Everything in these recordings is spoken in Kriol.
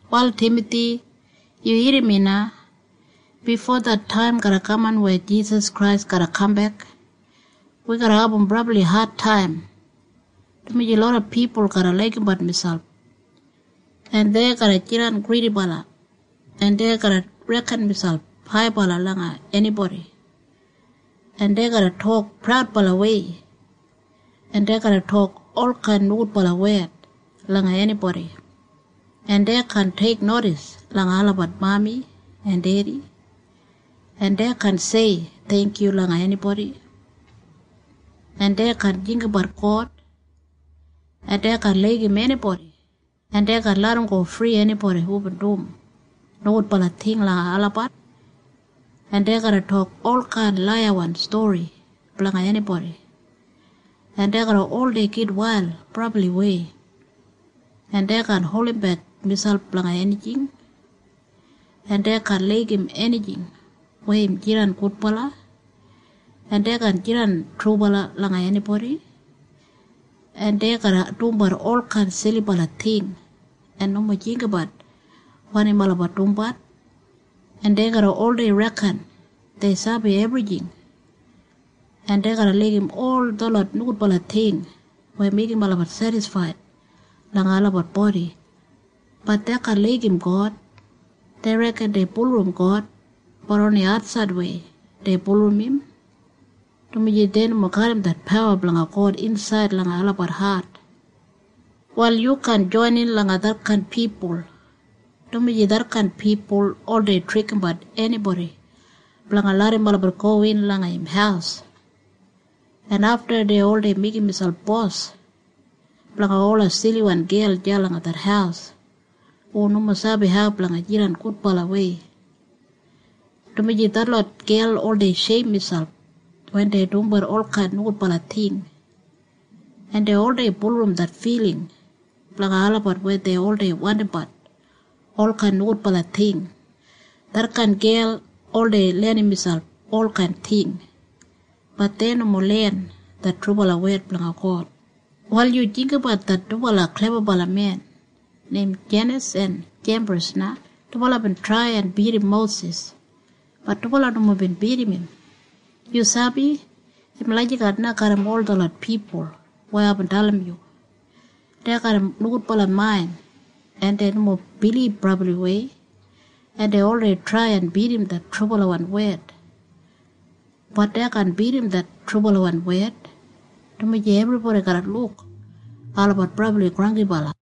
Wal Timathi, yu irrim mi na. Bifo det taim garra kaman weya Jisas Krais garra kambek, wi garra abum brabli adtaim, dumaji loda pipul garra laigimbat miselp, en dei garra jidan gridibala, en dei garra reken miselp haibala langa enibodi, en dei garra tok praudbalawei, en dei garra tok olkain nogudbala wed langa enibodi, en dei kaan teiknodis langa olabat mami en dedi, en dei kaan tok theingkyu langa enibodi, en dei kaan jinggabat God, en dei kaan laigim enibodi, en dei kaan larramgo fri enibodi hubin dum nogudbala ting langa olabat, en dei garra tok olkain laiyawan stori blanga enibodi, en dei garra oldei gitwail brabliwei, en dei kaan holdimbek miselp blanga enijing, en dei kaan laigim enijing weya im jidan gudbala, en dei kaan jidan trubala langa enibodi, en dei garra dumbat olkain silibala ting en nomo jinggabat wanim olabat dumbat, en dei garra oldei reken dei sabi ebrijing, en dei garra laigim ol detlot nogudbala ting weya meigim olabat sedisfaid langa olabat bodi. Bat dei kaan laigim God. Dei reken dei bulurrum God. Bat oni atsaidwei dei bulurrum im, dumaji dei nomo garram det pawa blanga God insaid langa olabat hat. Wal yu kaan joinin langa detkain pipul, dumaji detkain pipul oldei trikimbat enibodi blanga larram olabat gowin langa im haus, en afta dei oldei meigim miselp bos blanga ola siliwan gel deya langa det haus hu nomo sabi hau blanga jidan gudbalawei. Dumaji detlot gel oldei sheim miselp wen dei dumbat olkain nogudbala ting, en dei oldei bulurrum det filing blanga olabat weya dei oldei wandimbat olkain nogudbala ting. Detkain gel oldei lenim miselp olkain ting. Bat dei nomo len det trubalawan wed blanga God. Wal yu jinggabat det dubala klebabala men neim Jeinis en Jembris na. Dubala bin trai en bidim Mosis. Bat dubala nomo bin bidim im. Yu sabi? Im lagijat na garram ol detlot pipul weya aibin dalim yu. Dei garram nogudbala main, en dei nomo bilib brabliwei, en dei oldei trai en bidim det trubalawan wed. Bat dei kaan bidim det trubalawan wed, dumaji ebribodi garra luk olabat brabli granggibala.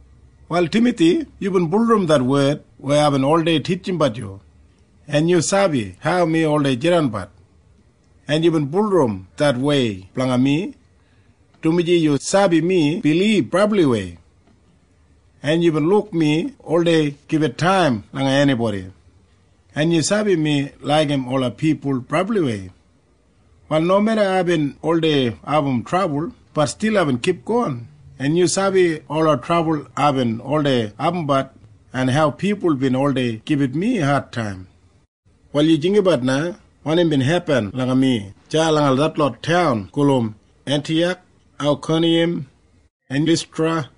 Wal Timathi, yubin bulurrum det wed weya aibin oldei titjimbat yu, en yu sabi hau mi oldei jidanbat, en yubin bulurrum det wei blanga mi, dumaji yu sabi mi bilib brabliwei, en yubin luk mi oldei gibit taim langa enibodi, en yu sabi mi laigim ola pipul brabliwei, wal nomeda aibin oldei abum trabul, bat stil aibin kipgon, en yu sabi ola trabul aibin oldei abumbat en hau pipul bin oldei gibit mi adtaim. Wal yu jinggabat na wanim bin hepin langa mi deya langa detlot taun gulum Entiyak, Aikoniyam en Listra.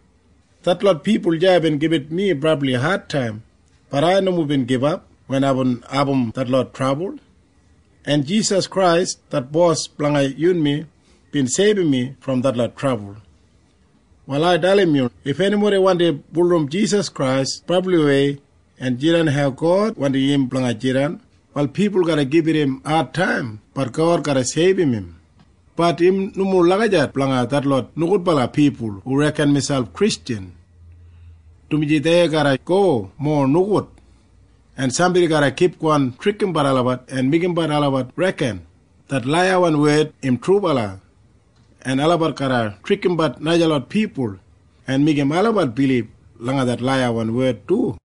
Detlot pipul deya bin gibit mi brabli adtaim. Bat ai nomo bin gibap wen aibin abum detlot trabul, en Jisas Krais det Bos blanga yunmi bin seibum mi brom detlot trabul. Wal ai dalim yu. If enibodi wandi bulurrum Jisas Krais brabliwei en jidan hau God wandim im blanga jidan, wal pipul garra gibit im adtaim. Bat God garra seibum im. Bat im nomo lagijat blanga detlot nogudbala pipul hu reken miselp Kristjan, dumaji dei garra go mowa nogud, en sambodi garra kipgon trikimbat olabat en meigimbat olabat reken det laiyawan wed im trubala, en olabat garra trikimbat najalot pipul en meigim olabat bilib langa det laiyawan wed du.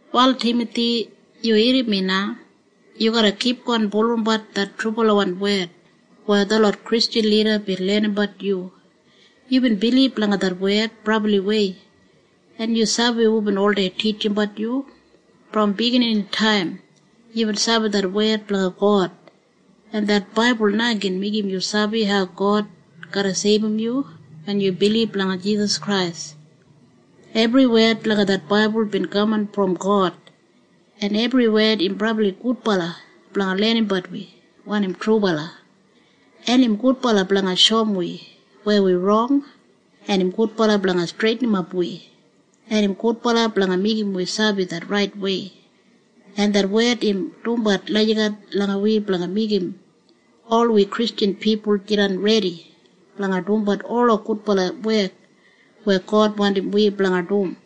Wal Timathi, yu irrim mi na. Yu garra kipgon bulurrumbat det trubalawan wed weya detlot Kristjan lida bin lenimbat yu. Yubin bilib langa det wed brabliwei, en yu sabi hubin oldei titjimbat yu. Brom bigininitaim yubin sabi det wed blanga God, en det baibul na gin meigim yu sabi hau God garra seibum yu wen yu bilib langa Jisas Krais. Ebri wed langa det baibul bin kaman brom God, en ebri wed im brabli gudbala blanga lenimbat wi wanim trubala, en im gudbala blanga shoum wi weya wi rong, en im gudbala blanga streitinimap wi, en im gudbala blanga meigim wi sabi det raitwei, en det wed im dumbat lagijat langa wi blanga meigim ol wi Kristjan pipul jidan redi blanga dumbat ola gudbala wek weya God wandim wi blanga dum.